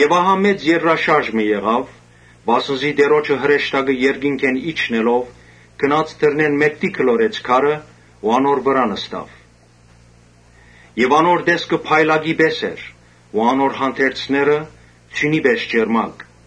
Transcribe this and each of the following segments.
Ահա մեծ երկրաշարժ մը եղաւ, վասն զի Տէրոջը հրեշտակը երկինքէն իջնելով, գնաց դռնէն մէկդի գլորեց քարը ու անոր վրայ նստաւ։ Անոր տեսքը փայլակի պէս էր ու անոր հանդերձները՝ ձիւնի պէս ճերմակ։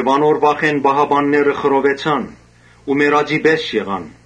Անոր վախէն պահապանները խռովեցան ու մեռածի պէս եղան։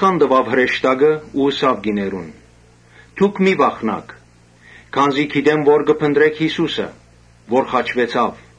Հրեշտակը ըսաւ կիներուն. «Մի՛ վախնաք, քանզի գիտեմ թէ կը փնտռէք Յիսուսը որ խաչուեցաւ։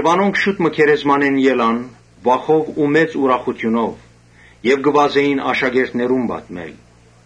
Անոնք շուտ մը գերեզմանէն ելան վախով ու մեծ ուրախութիւնով եւ վազեցին աշակերտներուն պատմելու։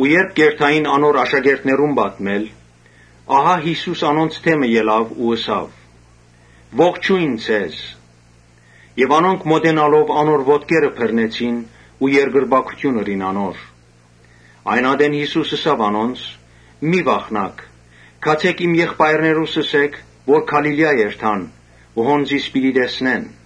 Երբ կ’երթային անոր աշակերտներուն պատմելու, Յիսուս անոնց դէմը ելաւ ու ըսաւ. «Ողջո՜յն ձեզ»։ Անոնք մօտենալով անոր ոտքերը բռնեցին ու երկրպագութիւն ըրին անոր։ Այն ատեն Յիսուս ըսաւ անոնց. «Մի՛ վախնաք, գացէք իմ եղբայրներուս ըսէք, որ Գալիլիա երթան։ Հոն զիս պիտի տեսնեն»։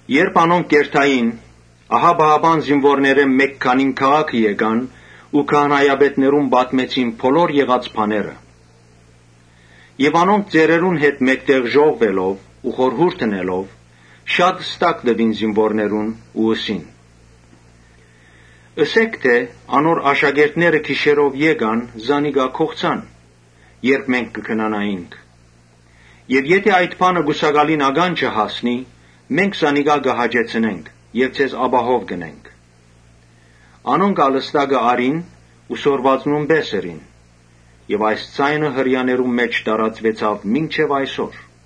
Երբ անոնք կ’երթային, պահապան զինուորներէն մէկ քանին քաղաքը գացին ու քահանայապետներուն պատմեցին բոլոր եղած բաները։ Անոնք ալ ծերերուն հետ հաւաքուելով ու խորհուրդ ընելով՝ շատ ստակ տուին զինուորներուն, Ու ըսին. «Ըսէք թէ ‘Անոր աշակերտները գիշերով եկան զանիկա գողցան, երբ մենք կը քնանայինք’։ Եթէ այդ բանը կուսակալին ականջը հասնի, մենք զանիկա կը հաճեցնենք եւ ձեզ Յուն., անհոգապահով կ’ընենք»։ Անոնք ալ ստակը առին ու սորվածնուն պէս ըրին. եւ այս ձայնը Հրեաներուն մէջ տարածուեցաւ մինչեւ այսօր։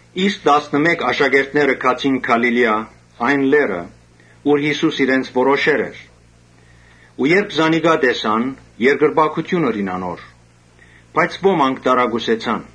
Իսկ տասնըմէկ աշակերտները գացին Գալիլիա, այն լեռը ուր Յիսուս իրենց որոշեր էր։ Երբ զանիկա տեսան, երկրպագութիւն ըրին անոր, բայց ոմանք տարակուսեցան։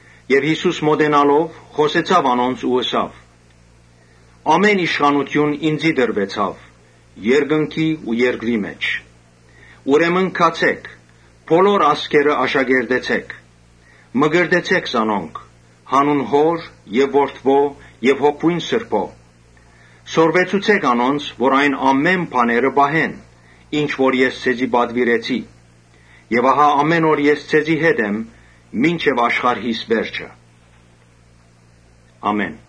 Յիսուս մօտենալով՝ խօսեցաւ անոնց ու ըսաւ. «Ամէն իշխանութիւն ինծի տրուեցաւ երկնքի ու երկրի մէջ։ Ուրեմն գացէ՛ք բոլոր ազգերը աշակերտեցէք, մկրտեցէ՛ք զանոնք յանուն Հօր եւ Որդւոյ եւ Հոգւոյն Սրբոյ. Սորվեցուցէք անոնց որ այն բոլոր բաները պահեն՝ ինչ որ ես ձեզի պատուիրեցի։ Ահա ամէն օր ես ձեզի հետ եմ, մինչեւ աշխարհիս վերջը։ Ամէն»։